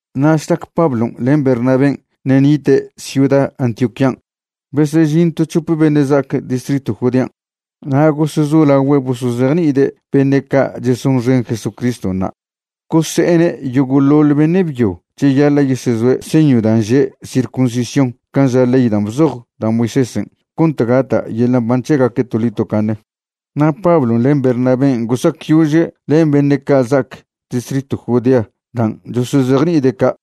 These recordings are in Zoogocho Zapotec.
Na' šlac Pablon' len Bernabén' ṉe' nite' ciuda Antioquían' besežin to c̱hope beṉe' za'ac distritw Judean' na' gosezolagüe' bosozejni'ide' beṉe' ca' chesonxen Jesucriston' na'. Gose'ene' yogo'ḻoḻ beṉe' byo cheyaḻa' yesezoe' señw dan' že' circuncisión can' ža ley dan' bzoj da' Moisésen' cont gata' yeḻa' mban c̱hegaque' toḻi tocaṉe. Na' Pablon' len Bernabén' gosacyože' len beṉe' ca' za'ac distritw Judea dan' chosozejni'ide' ca'.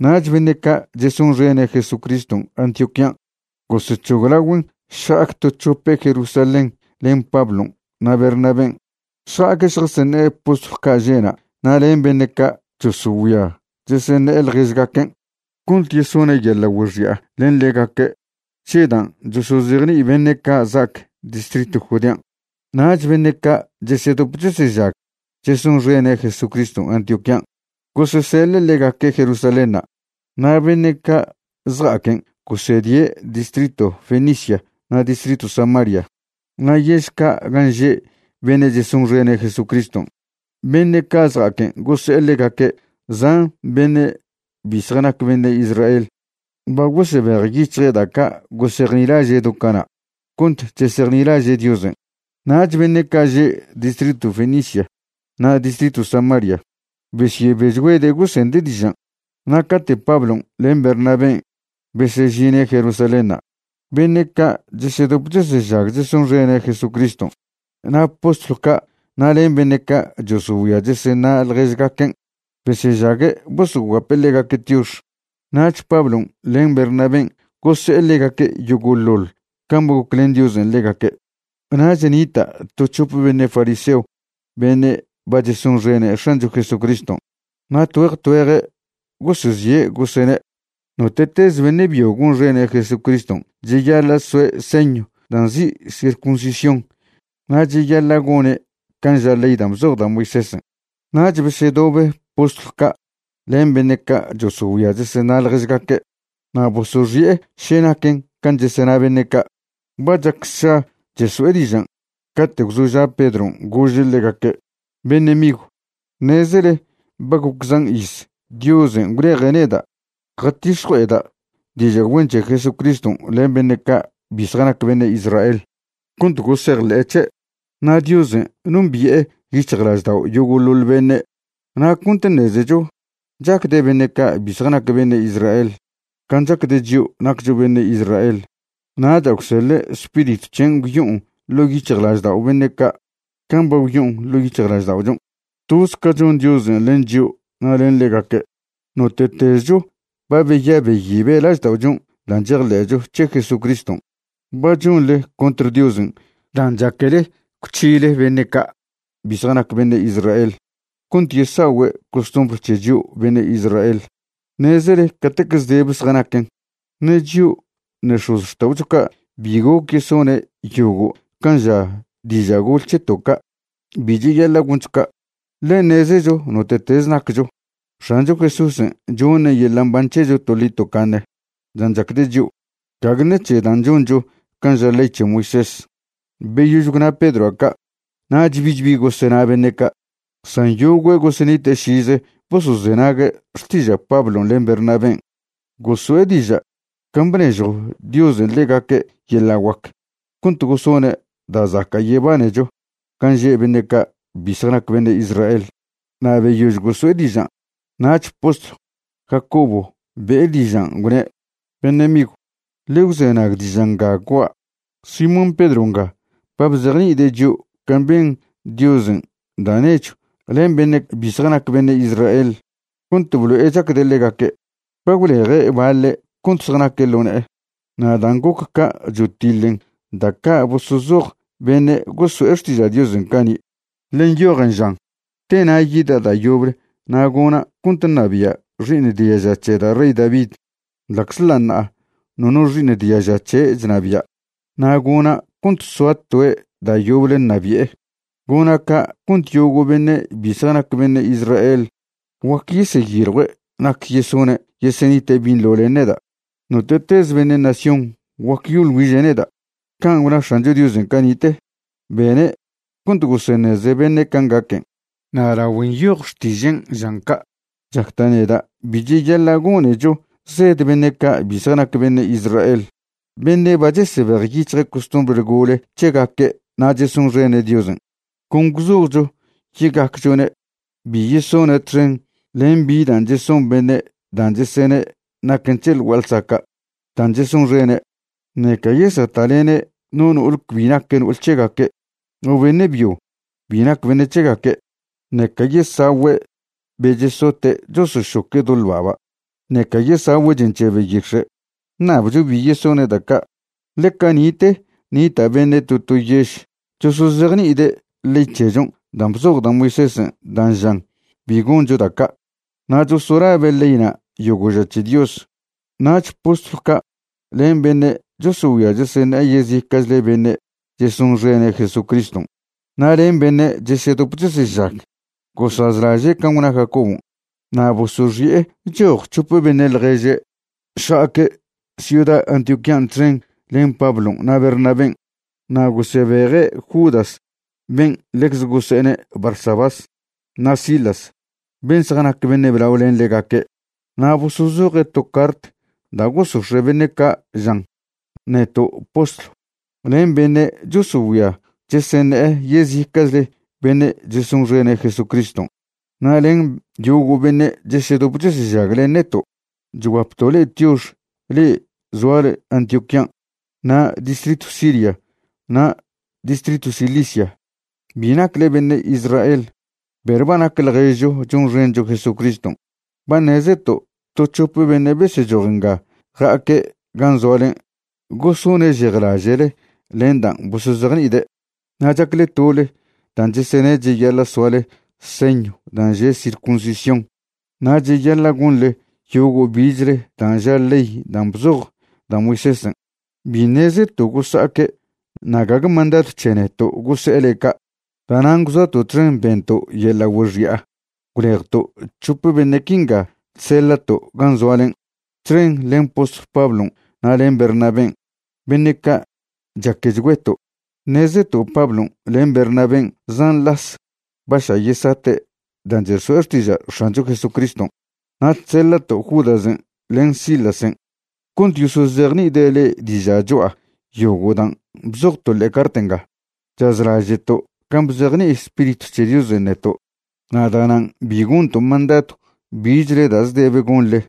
Nach beṉe' ca' chesonxene' Jesucriston' Antioquían' gosec̱hoglagüen' šja'ac to c̱hope' Jerusalén len Pablon' na' Bernabén'. Šja'aque' šjaseṉe'e postlw ca' že'na' na' len beṉe' ca' chosogüia cheseṉe'e ḻježgaquen' cont yesone' yeḻa' güexi'a len ḻegaque' c̱he dan' chosozejni'i beṉe' ca' za'ac distritw Judean'. Nach beṉe' ca' chesedop chesežag chesonxene' Jesucriston' Antioquían' goseseḻe' ḻegaque' Jerusalénṉa'. Na' beṉe' ca' zja'aquen' gosedie' distritw Fenicia na' distritw Samaria. Na' yež ca' gan' že' beṉe' chesonxene' Jesucriston', beṉe' ca' zja'aquen' gose'e ḻegaque' zan beṉe' bi zjanac beṉe' Israel ba gosebejyic̱hje' da' ca' gosejnilaže' do cana' cont chesejnilaže' Diosen'. Nach beṉe' ca' že' distritw Fenicia na' distritw Samaria besyebechgüede' gosende' dižan'. Na' cate' Pablon' len Bernabén' besežine' Jerusalénṉa', beṉe' ca' chesedop chesežag chesonxene' Jesucriston', na' postlw ca' na' len beṉe' ca' chosogüia cheseṉa' ḻježgaquen' besežague' bosoguape' ḻegaque' tiox. Nach Pablon' len Bernabén' gose'e ḻegaque' yogo'ḻoḻ can' ba goclen Diosen' ḻegaque'. Nach nita' to c̱hope beṉe' Fariseo beṉe' ba chesonxene' X̱ancho Jesucriston', na' tgüeje tgüeje' gosezie' gosene': ―Note'tez beṉe' byo gonxene' Jesucriston' cheyaḻa' soe' señw dan' nzi' circuncisión na' cheyaḻa' gone' can' ža ley dan' bzoj da' Moisésen'. Nach besedobe postlw ca' len beṉe' ca' chosogüia cheseṉa' ḻježgaque', na' bosoxi'e še naquen can' chesena beṉe' ca'. Ba chac sša cheso'e dižan' cate' gwzoža' Pedron' gože' ḻegaque': ―Beṉe' migw, ṉezele ba goc zan iz Diosen' gwleje' neda' jatix̱jue'eda' diža' güen c̱he Jesucriston' len beṉe' ca' bi zjanac beṉe' Israel cont gosejḻe'e c̱he'. Na' Diosen' nombi'e yic̱hjlaždao' yogo'ḻoḻ beṉe', na' cont ṉezecho chacde' beṉe' ca' bi zjanac beṉe' Israel can' chacde' chio' naccho beṉe' Israel, nacha' gwseḻe' Spiritw c̱hen' gwyo'on ḻo' yic̱hjlaždao' beṉe' ca' can' ba gwyo'on ḻo' yic̱hjlažda'ochon'. Toz ca chon Diosen' len chio' na' len ḻegaque', note'tezcho ba beya' beyibe' lažda'ochon' dan' chejḻe'cho c̱he Jesúcriston'. Ba chonḻe contr Diosen' dan' chaquele gwc̱hile beṉe' ca' bi zjanac beṉe' Israel cont yesa'ogüe' costumbr c̱he chio' beṉe' Israel. Ṉezele catec zdebe zjanaquen, ṉe chio' ṉe x̱ozxta'ocho ca' bi goc yesone' yogo' can' ža diža' gol c̱heto' ca'. Bi cheyaḻa' goncho ca', ḻe ṉezecho note'tez naccho, X̱ancho Jesúsen' choṉe' yeḻa' mban c̱hecho toḻi tocaṉe dan' chacde' chio', gague ṉec̱he dan' choncho can' ža ley c̱he Moisés. Beyož gwna Pedroa' ca' nach bich bi gosena beṉe' ca', san yogüe' gosenite' šize bosozenague' xtiža' Pablon' len Bernabén'. Goso'e diža' can' bnežjo Diosen' ḻegaque' yeḻa' guac cont gosone' da' zaca' yebanecho gan' že' beṉe' ca' bi zjanac beṉe' Israel. Na' beyož goso'e dižan' nach postlw Jacobo be'e dižan', gwne': ―Beṉe' migw, ḻe gwzenag diža' nga gua'a. Simón Pedro nga ba bzejni'ide' chio' can' ben Diosen' da' nechw len beṉe' bi zjanac beṉe' Israel cont blo'e chacde' ḻegaque', ba gwleje' baḻe' cont zjanaque' ḻo ne'e. Na' dan' goc ca' chotiḻen da' ca' bosozoj beṉe' goso'e xtiža' Diosen' cani', ḻe nyojen žan: Tena' yida' da' yoble na' gona' cont ṉabia' xi'iṉ diaža c̱he da' rey David, ḻa'czḻa' ṉa'a nono xi'iṉ diaža c̱he' chnabia', na' gona' cont soa toe' da' yoble ṉabi'e. Gona' ca' cont yogo' beṉe' bi zjanac beṉe' Israel guac yeseyiljue' nac yesone' yesenite' binḻo len neda'. Note'tez beṉe' nación guac yosoḻ güiže' neda'. Can' gwna X̱ancho Diosen' cani'te, bene' cont goseṉeze beṉe' can' gaquen'. ’Na' lagüe nyoj Xtižen' žan ca', chacda' neda' bi cheyaḻa' gonecho zed beṉe' ca' bi zjanac beṉe' Israel beṉe' ba chesebejyic̱hje' costumbr gole c̱hegaque' na' chesonxene' Diosen'. Con gwzojcho ye'gacchone' bi yesone' txen len bi dan' cheson beṉe' dan' chesene' naquen c̱he ḻ gua'a ḻsaca' dan' chesonxene', ṉeca yesata'lene' no no'ol cbi nac no'ol c̱hegaque' o beṉe' byo cbi nac beṉe' c̱hegaque', ṉeca yesagüe' be chesote' chosošoque' do ḻba'ba', ṉeca yesagüe' chen c̱he beyix̱e'. Ṉabcho bi yesone' da' ca', ḻe cani'te nita' beṉe' to to yež chosozejni'ide' ley c̱hechon' dan' bzoj da' Moisésen' dan' žan bi goncho da' ca', na' chosolabe' leyna' yogo' ža c̱he Dios. Nach postlw ca' len beṉe' chosogüia cheseṉe'e yezica'chle beṉe' chesonxene' Jesucriston', na' len beṉe' chesedop chesežag, gosazlaže' can' gwna Jacobon', na' bosoxi'e choj c̱hope beṉe' ḻježe' šja'aque' ciuda Antioquían' txen len Pablon' na' Bernabén'. Na' gosebeje' Judas ben' ḻecze gože'ne' Barsabás, na' Silas, ben' zjanac beṉe' blao len ḻegaque'. Na' bosozoje' to cart da' gosox̱e' beṉe' ca' žan: “Neto' postlw, len beṉe' chosogüia cheseṉe'e yezica'chle beṉe' chesonxene' Jesucriston', na' len yogo' beṉe' chesedop chesežag len neto', chguapto' le'e tiox le'e zoale Antioquían' na' distritw Siria na' distritw Cilicia. Bi nacle beṉe' Israel perw ba nac ḻježcho chonxencho Jesucriston'. Ba ṉezeto' to c̱hope beṉe' besechoj nga ja'aque' gan' zoalen' gosone' šejlaže'le len dan' bosozejni'ide', na' chacle tole dan' chesene' cheyaḻa' soale señw dan' že' circuncisión na' cheyaḻa' gonḻe yogo' bichle dan' ža ley dan' bzoj da' Moisésen'. Bi ṉezeto' gosa'aque' na' gague mandadw c̱he neto' gose'e le'e ca'. Da'nan' gwzoato' txen bento' yeḻa' güexi'a gwlejto' c̱hope beṉe' quinga chseḻa'to' gan' zoalen', txen len postlw Pablon' na' len Bernabén', beṉe' ca' chaquechgüeto'. Ṉezeto' Pablon' len Bernabén' zan las ba ša' yesate' dan' cheso'e xtiža' X̱ancho Jesucriston'. Na' chseḻa'to' Judasen' len Silasen' cont yosozejni'ide' le'e diža' cho'a yogo' dan' bzojto' ḻe'e cart nga. Chazlaže'to' can' bzejni'i Spiritw c̱he Diosen' neto', na' da'nan' bi gonto' mandadw bichle da' zdebe gonḻe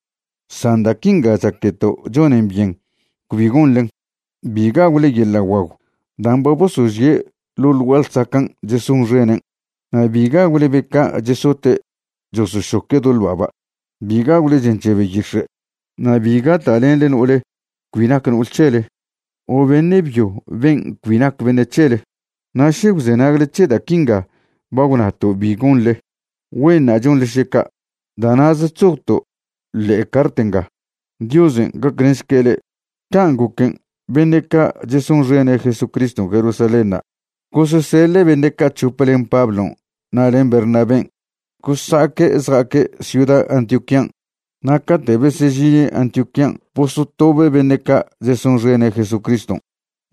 san da' quinga chaqueto' chonen byen cbi gonḻen. Bi gagwle yeḻa' guagw dan' ba bosožie' ḻo ḻ gua'a ḻsacan' chesonxenen', na' bi gagwle be ca' chesote' chosošoque' do ḻba'ba', bi gagwle chen c̱he beyix̱e', na' bi gata'lenḻe no'ol cbi nac no'ol c̱hele o beṉe' byo ben' cbi nac beṉe' c̱hele. Na' še gwzenagle c̱he da' quinga ba gwnato' bi gonḻe, güenṉa' chonḻe še ca'. Da' na'ze chzojto' ḻe'e cart nga. Diosen' gaclenšque' le'e.” Can' goquen' beṉe' ca' chesonxene' Jesucriston' Jerusalénṉa' goseseḻe' beṉe' ca' c̱hope len Pablon' na' len Bernabén' gosa'aque' zja'aque' ciuda Antioquían'. Na' cate' besežine' Antioquían' bosotobe' beṉe' ca' chesonxene' Jesucriston'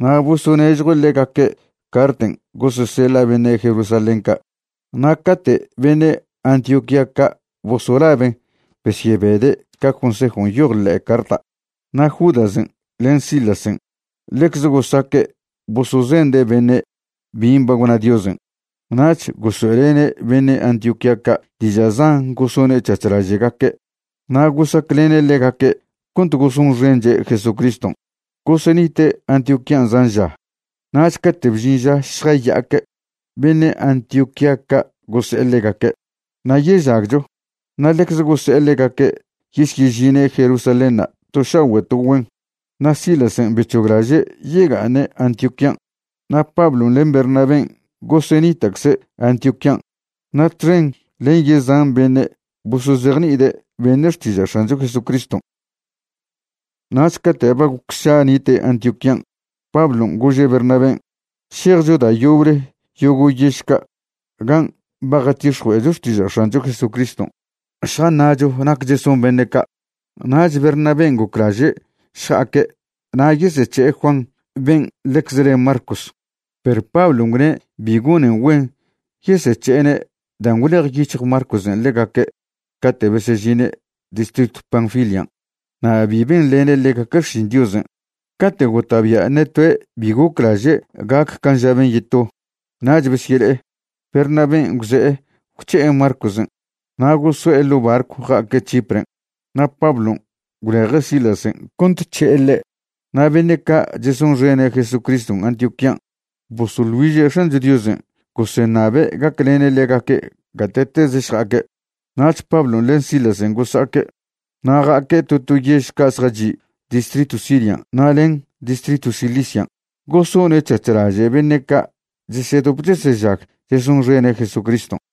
na' bosonežjue' ḻegaque' carten' goseseḻa' beṉe' Jerusalén ca'. Na' cate' beṉe' Antioquía ca' bosolaben' besyebede' ca consejon' nyoj ḻe'e carta'. Na' Judasen' len Silasen' ḻecze gosaque' bosozende' beṉe' bin' ba gwna Diosen'. Nach gosoe'lene' beṉe' Antioquía ca' diža' zan gosone' c̱hac̱h laže'gaque' na' gosaclene' ḻegaque' cont gosonxenche' Jesucriston'. Gosenite' Antioquían' zan ža, nach cate' bžin ža šjaya'aque', beṉe' Antioquía ca' gose'e ḻegaque': “Nayežagcho”, na' ḻecze gose'e ḻegaque' yesyežine' Jerusalénṉa' to šagüe' to güen. Na' Silasen' bec̱hoglaže' yega'aṉe' Antioquían'. Na' Pablon' len Bernabén' gosenita'cze' Antioquían' na' txen len yezan beṉe' bosozejni'ide' beṉe' xtiža' X̱ancho Jesucriston'. Nach cate' ba goc sša nite' Antioquían', Pablon' gože' Bernabén': ―Šejcho da' yoble yogo' yež ca' gan' ba jatix̱jue'echo xtiža' X̱ancho Jesucriston' šjaṉa'cho nac cheson beṉe' ca'. Nach Bernabén' goclaže' šja'aque' na' yesec̱he'e Juan ben' ḻecz le Marcos. Perw Pablon' gwne' bi gonen güen yesec̱he'ene' dan' gwlejyic̱hj Marcosen' ḻegaque' cate' besežine' distritw Panfilian' na' bi benḻene' ḻegaque' xšin Diosen'. Cate' gota'bia' ṉe toe' bi goclaže' gac can' ža ben' yeto, nach besyele'e. Bernabén' gwze'e gwc̱he'e Marcosen' na' goso'e ḻo' barcw ja'aque' Chipren'. Na' Pablon' gwleje' Silasen' cont c̱he'e ḻe'. Na' beṉe' ca' chesonxene' Jesucriston' Antioquían' bosoḻ güiže' X̱ancho Diosen' goseṉabe' gaclene' ḻegaque' gate'tez šja'aque'. Nach Pablon' len Silasen' gosa'aque'. Na' ja'aque' to to yež ca' zjachi' distritw Sirian' na' len distritw Cilician' gosone' c̱hac̱h laže' beṉe' ca' chesedop chesežag chesonxene' Jesucriston'.